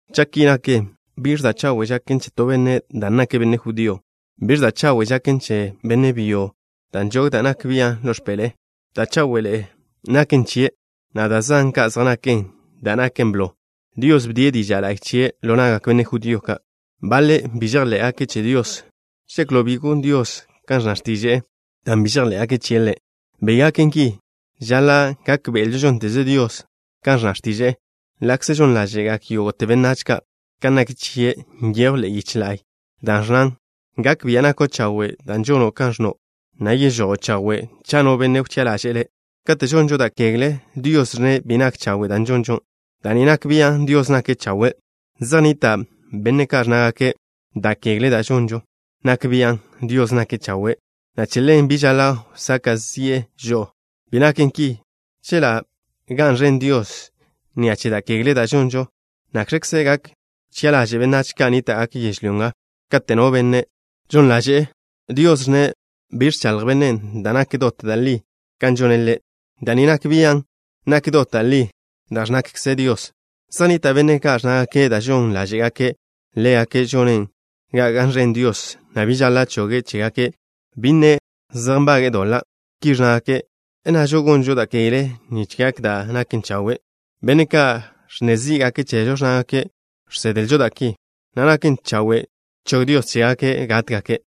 Cha' ki naken, ¿biẕ da' chawe' žaken che to benne' dan' nake' benne' judío? ¿Biẕ da' chawe' žaken che benne' byo, benne' judío, dan' nžog da' nak bian' ḻo x̱peḻe'e? Da' cháwe'ḻe'e naken chie', na' da' zan kan zej naken. Da' naken blo, Dios bdie' diža' la'y chie' ḻo na'gak benne' judío ka'. Baḻe' bi žejḻé'gake' che Dios. ¿Žeklo' bi gon Dios kan ẕnna x̱tiže'e dan' bi žejḻé'gake' chie' Ḻe'? Bi gaken ki. Žaḻa' gákbe'elžo žónteze Dios kan ẕnna x̱tiže'e, ḻa'kze žon ḻáže'gak yógo'te benách ka'. Kan nak chie' nyejw ḻe'e yiche la'y, da' ẕnnan: Gak bia' nako' chawe' dan' žono' kan ẕnno', na' yežojo' chawe' cha' no benne' wchi'a ḻaže'e Le'. Kate' žonžo da' kegle, Dios ẕnne' bi nak chawe' da' žonžo. Da' ni nak bian' Dios nake' chawe'. Zej nnita' benne' ka' ẕnnágake': “Da' kegle da' žonžo nak bian' Dios nake' chawe', na' che ḻen bi žaḻa' wsaka' zi'e žo'o.” Bi naken ki. Chela' ga'n ẕen Dios ni'a che da' kegle da' žonžo, ¿nakx̱kze gak wchi'a ḻaže'e benách ka' nníta'gake' yežlyó nga? Kate' no benne' žon ḻaže'e, Dios ẕnne' bi ẕchaḻj bennen' da' naken dot da' li kan žone' Ḻe'. Da' ni nak bian' nak dot da' li da' ẕnnakze Dios. Zej nnita' benne' ka' ẕnnágake' da' žon ḻáže'gake' ḻégake' žonen ga ga'n ẕen Dios, na' bi žaḻa' choge' chégake', bi nne' zej nbage'e doḻa'. Ki ẕnnágake'. ¿Nnažo: “Gonžo da' kegle nich gak da' nak chawe'?” Benne' ka' ẕnne zí'gake' chežo ẕnnágake' žsedlžo da' ki, na' naken chawe' chog Dios chégake' gátgake'.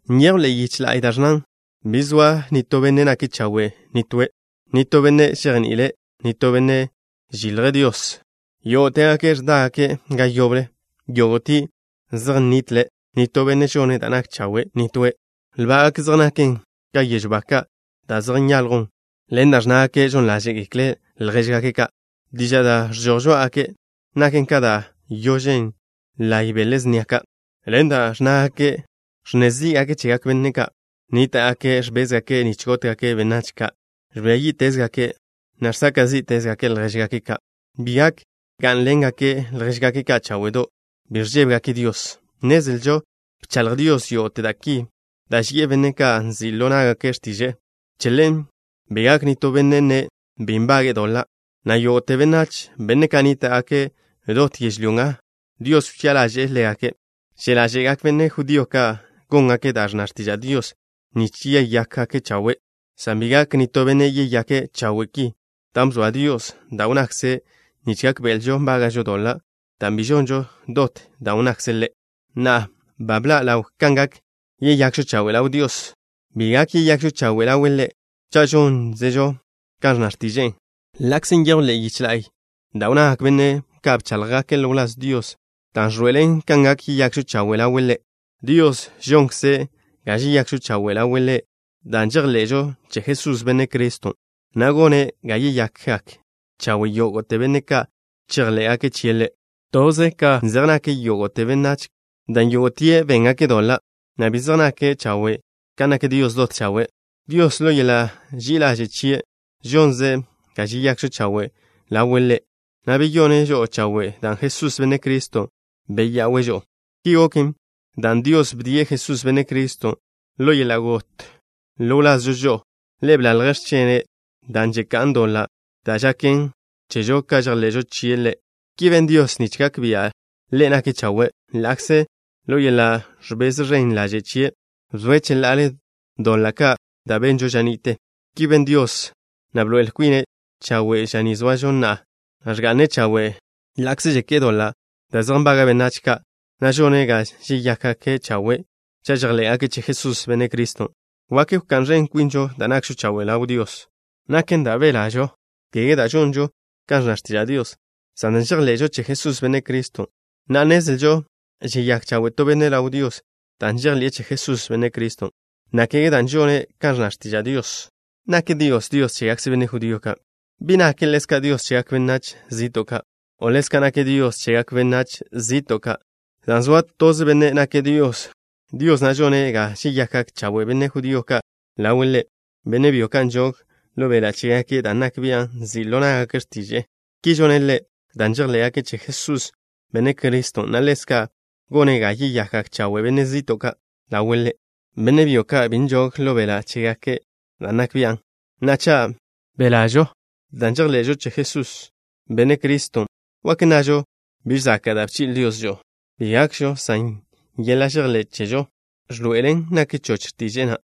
Nyejw ḻe'e yiche la'y da' ẕnnan: Bi zoa nitó benne' nake' chawe', nitóe'. Nitó benne' žejni'ile'. Nitó benne' žilje' Dios. Yógo'tegake' ẕdágake' ga yoble; yógo'tie' zej nnitle'. Nitó benne' žone' da' nak chawe', nitóe'. Lbá'gake' zej naken ka yežw ba ka' da' zej nyaljwn. Ḻen da' ẕnnágake' žon ḻáže'gekle' ljéžgake' ka'. Diža' da' žežojen žoá'agake' naken ka da' yožen laye' bele snia ka'. Ḻen da' ẕnnágake', ẕnne zí'gake' chegak benne' ka'. Nníta'gake' ẕbézgake' nich gótgake' benách ka'. Ẕbía yí'tezgake', na' žsaka' zí'tezgake' ljéžgake' ka'. Bi gak gá'nḻengake' ljéžgake' ka' cháwe'do'. Bi ẕžébegake' Dios. Nnezlžo bchaḻj Dios yógo'te da' ki, da' ži'e benne' ka' nzi' ḻo ná'gake' x̱tiže'e. Che ḻen bi gak nitó benne' nne' bi nbage'e doḻa', na' yógo'te benách, benne' ka' nníta'gake' dot yežlyó nga, Dios wchi'a ḻaže'e ḻégake'. Že' ḻáže'gak benne' judío ka' góngake' da' ẕnna x̱tiža' Dios nich yeyákgake' chawe', san bi gak nitó benne' yeyake' chawe' ki, dan' bzoa Dios da' wnnakze' nich gákbe'elžo nbága'žo doḻa', dan' bi žonžo dot da' wnnakze' Ḻe'. Na'a, ba bḻa' ḻaw kan gak yeyakžo chawe' ḻaw Dios. Bi gak yeyakžo chawe' ḻawe' Ḻe' cha' žónzežo kan ẕnna x̱tiže'e, ḻa'kze nyejw ḻe'e yiche la'y da' wnnagak benne' ka' bcháḻjgake' ḻo wláz Dios, dan' ẕḻoe'elen kan gak yeyakžo chawe' ḻawe' Ḻe'. Dios žonkze' ga žeyakžo chawe' ḻawe' Ḻe' dan' žejḻe'žo che Jesús, Benne' Criston', na' gone' ga yeyakgak chawe' yógo'te benne' ka' chejḻé'gake' chie' Ḻe'. Tḻebe zej nak yógo'te benách, dan' yógo'tie' béngake' doḻa', na' bi zej nake' chawe' kan nak Dios dot chawe'. Dios, ḻo yeḻa' ži'i ḻaže' chie', žonze' ga žeyakžo chawe' ḻawe' Ḻe', na' beyone' žo'o chawe' dan' Jesús, Benne' Criston', beya'we' žo'o. Ki goken dan' Dios bdie' Jesús, Benne' Criston', ḻo yeḻa' got ḻo wlazžo žo'o. Ḻe' bḻalje' x̱chene', da' žeká'n doḻa', dan' žaken chežo cha' žejḻe'žo chie' Ḻe'. Ki ben Dios nich gak bia' Ḻe' nake' chawe', ḻa'kze ḻo yeḻa' ẕbez ẕen ḻaže' chie' bzoe' cheḻa'ale doḻa' ka' da' benžo ža ni'te. Ki ben Dios, na' bḻoe'el kwine' chawe' ža ni zoažo na'a, na' ẕga'ne' chawe' ḻa'kze žeké'e doḻa' da' zej nbaga' benách ka', na' žone' ga žeyákgake' chawe' cha' žejḻé'gake' che Jesús, Benne' Criston'. ¿Wak wká'n ẕen kwinžo dan' nakžo chawe' ḻaw Dios? Bi gakžo. ¿Biẕ chen'? Naken dan' belažo, kege dan' žonžo kan ẕnna x̱tiža' Dios, san dan' žejḻé'zežo che Jesús, Benne' Criston'. Na'a, nnezlžo žeyák chawe' to benne' ḻaw Dios dan' žejḻi'e che Jesús, Benne' Criston', na' kege dan' žone' kan ẕnna x̱tiža' Dios. ¿Nak Dios Dios chégakze benne' judío ka'? ¿Bi nake' ḻezka' Dios chegak benách zi'to' ka'? O', ḻezka' nake' Dios chegak benách zi'to' ka', dan' zoa toze Benne' nake' Dios. Dios na' žone' ga žeyakgak chawe' benne' judío ka' ḻawe' Ḻe', benne' byo ka' nžog ḻo beḻa' chégake' dan' nak bian' nzi' ḻo ná'gake' x̱tiže'e. Ki žone' Ḻe' dan' žejḻé'gake' che Jesús, Benne' Criston', na' ḻezka' gone' ga yeyakgak chawe' benne' zi'to' ka' ḻawe' Ḻe', benne' byo ka' bi nžog ḻo beḻa' chégake' dan' nak bian'. Na'a, cha' belažo dan' žejḻe'žo che Jesús, Benne' Criston', ¿wak nnažo biž zaka' da' bchi'le Dios žo'o? Bi gakžo, san yeḻa' žejḻé' chežo ẕḻoe'elen nak choch x̱tiže'e na'.